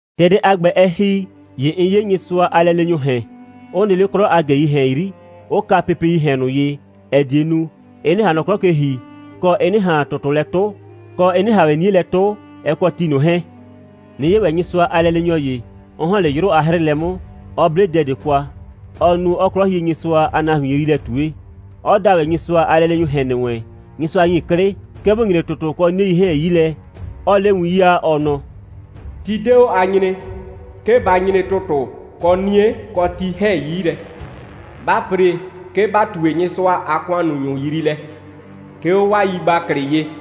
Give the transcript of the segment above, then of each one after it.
‑Tɛ dɛ a ‑gbɛ, ɛ ‑hi, ‑ye 'n 'ye Nyɩsʋa a lɛleenyʋʋ ‑hɛn, 'ʋ nɩ 'le 'klɔ a ꞊gɛii ‑hɛn 'yri, 'ʋ ka pepeii ‑hɛn ꞊nʋ ye, ‑ɛ die nu, ɩ 'nɩ ꞊han nɔ 'klɔ ke ‑hi, kɔ, ɩ 'nɩ ꞊han ‑tʋtʋ lɛ 'tʋ, kɔ, ɩ 'nɩ ꞊han ‑wɛ 'nie lɛ 'tʋ, ɛ kɔ ti ꞊nʋ 'hɛɛn; 'nɩ 'ye ‑wɛ Nyɩsʋa a lɛleenyɔ ‑ye, 'ɔ ‑hɔn 'le 'yrʋ a 'hrɩɩlɛ 'mʋ, 'ɔ 'ble dɛ ꞊de kwa, ɔɔ nu, 'ɔɔ 'Klɔhienyɩsʋa a nahuin yriilɛ ꞊tue; 'ɔ da ‑wɛ Nyɩsʋa a lɛleenyʋʋ ‑hɛn ‑nɩ wɛn, Nyɩsʋa ‑nyi 'klɩ, 'ke bʋ nyre ‑tʋtʋ kɔ 'nie 'hɛɛn 'yi lɛ, 'ɔɔ 'le win 'yaa, ɔ nɔ: «Ti 'de 'o a nyree, 'ke ba nyre ‑tʋtʋ, kɔ 'nie, kɔ ti 'hɛɛn 'yi lɛ. Ba ‑pre, 'ke ‑ba ꞊tue Nyɩsʋa a ‑kʋannunyʋ yriilɛ, 'ke 'o 'waa yigbaklɩ ye.»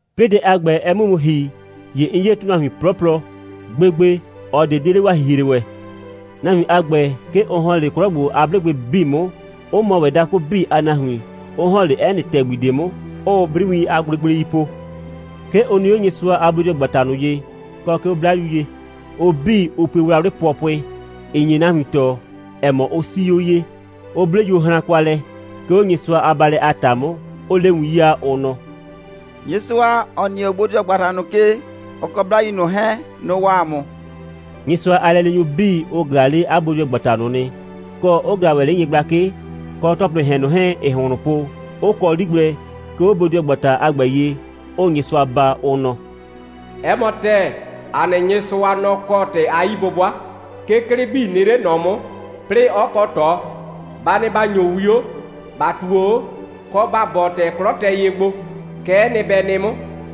'Plɩɩ dɛ a ‑gbɛ, ɛ 'mʋ mu ‑hi, ‑ye 'n 'ye ‑tʋnahuin 'plɔplɔ. Gbegbe, ꞊ɔ ꞊de 'de 'le 'waa ‑hihre ‑wɛ. Nahuin a ‑gbɛ, 'ke ʋ ‑hɔn 'le 'klɔ ‑gbo a 'blʋgbɩ 'bii 'mʋ, 'ʋ mɔ ‑wɛ dakʋ 'bii a nahuin, 'ʋ ‑hɔn 'le 'ɛ nɩ ‑tɛgbi ꞊de 'mʋ, 'ʋʋ 'briwiin a gblegblei po. 'Ke ʋ nɩ 'o Nyɩsʋa a bodɩɔgbata ꞊nʋ ye, kɔ 'ke 'o 'Blayu ye. Ʋ 'bii, ʋ pue wlawlɩ pʋɔpʋɩ, (‑ɩ nye nahuin tɔɔ, ‑ɛ mɔ, ʋ 'sii 'o ye,) 'ʋ 'ble yuohran kwa lɛ, 'ke 'o Nyɩsʋa a baalɛ a ‑ta 'mʋ, 'ʋʋ 'le win 'yaa, ʋ nɔ: «Nyɩsʋa, ‑ɔ nɩ 'o bodɩɔgbata ꞊nʋ ke, ɔ kɔ 'Blayu ꞊nʋ 'hɛɛn, nʋ‑ waa ‑a mʋ.» Nyɩsʋa a lɛleenyʋ 'bii, ʋ ꞊glaa 'le 'a bodɩɔgbata ꞊nʋ nɩ, kɔ, 'ʋ ꞊glaa ‑wɛ 'le nyɩgblakɩ kɔ ‑tɔplɩɩ ‑hɛn ꞊nʋ 'hɛɛn, ‑ɩɩ ‑hʋnhlʋn po, 'ʋ kɔ 'li gblɛ, 'ke 'o bodɩɔgbata a ‑gbɛ ye, 'ʋʋ Nyɩsʋa baa, ʋ nɔ: «'Ɛ mɔ ‑tɛɛ, ‑a nɩ Nyɩsʋa, nɔ‑ kɔ ‑tɩ a 'yi'bʋbʋa. 'Ke 'klɩ 'bii nɩ 'le ꞊nɔ 'mʋ, 'plɩɩ 'ɔ kɔ ꞊tɔ. Ba nɩ ‑ba ‑nyo 'wio, ‑ba ꞊tuo 'o, kɔ ‑ba bɔɔ, ‑tɛ 'klɔ tɛ ye gbo. Kɛ'ɛ nɩ, bɛ nɩ 'mʋ.»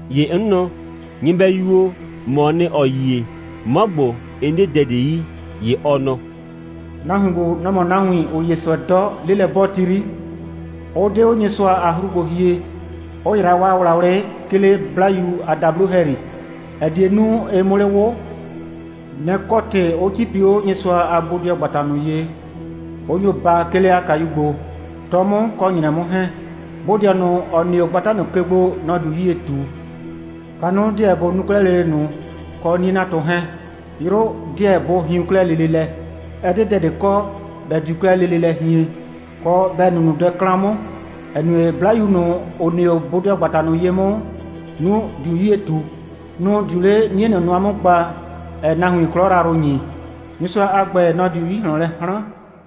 ‑Ye 'n nɔ: «Nyɩbɛyu o, ‑mɔɔ nɩ, ‑ɔ yie. 'Mɔ ‑gbo, 'n 'de 'a dɛ ꞊de yi.» ‑Ye ɔ nɔ: «Nahuin ‑gbo, nʋ‑ mɔ nahuin ꞊nʋ, ‑ʋ 'ye ꞊sʋɛ 'dɔ, 'lelɛ'bɔɔti 'yri, 'ʋ 'de 'o Nyɩsʋa a 'hru gbo hie, 'ʋ yra 'waa wlawlɩ, 'ke 'le 'Blayu a dablo ‑hɛyri, ‑ɛ die nu, ɩ 'mʋ 'le 'wʋ. Nɛ‑ kɔ ‑tɩ 'ʋ 'cipi 'o Nyɩsʋa a bodɩɔgbata ꞊nʋ ye, 'ʋ nyo baa, 'ke 'le 'a kayu gbo, 'tɔ 'mʋ kɔ ‑nyrɛ 'mʋ 'hɛɛn. Bodɩɔ ꞊nʋ, ‑ɔ nɩ 'o gbata ꞊nʋ ke gbo, nɔ‑ diu 'yie ꞊tu. Kanʋ 'deɛ bʋ nu 'klɛɛ lele ꞊nʋ, kɔ 'nie'natʋ 'hɛɛn. 'Yrʋ 'deɛ bʋ hiun 'klɛɛ lele lɛ. Ɛ 'de dɛ ꞊de kɔ, ‑bɛ diu 'klɛɛ lele lɛ hien, kɔ, ‑bɛ nu ꞊nʋ dɛ 'klan 'mʋ, ‑ɛ nue, 'Blayu ꞊nʋ, ‑ʋ nɩ 'o bodɩɔgbata ꞊nʋ ye 'mʋ, nʋ‑ diu 'yie ꞊tu. Nʋ‑ diu 'le 'nie ꞊nʋ nʋa 'mʋ gba, ‑ɛɛ nahuin 'klɔ yrayrʋ ‑nyi. Nyɩsʋa a ‑gbɛ, nɔ‑ diu 'yi ꞊hlɔn lɛ 'hran.»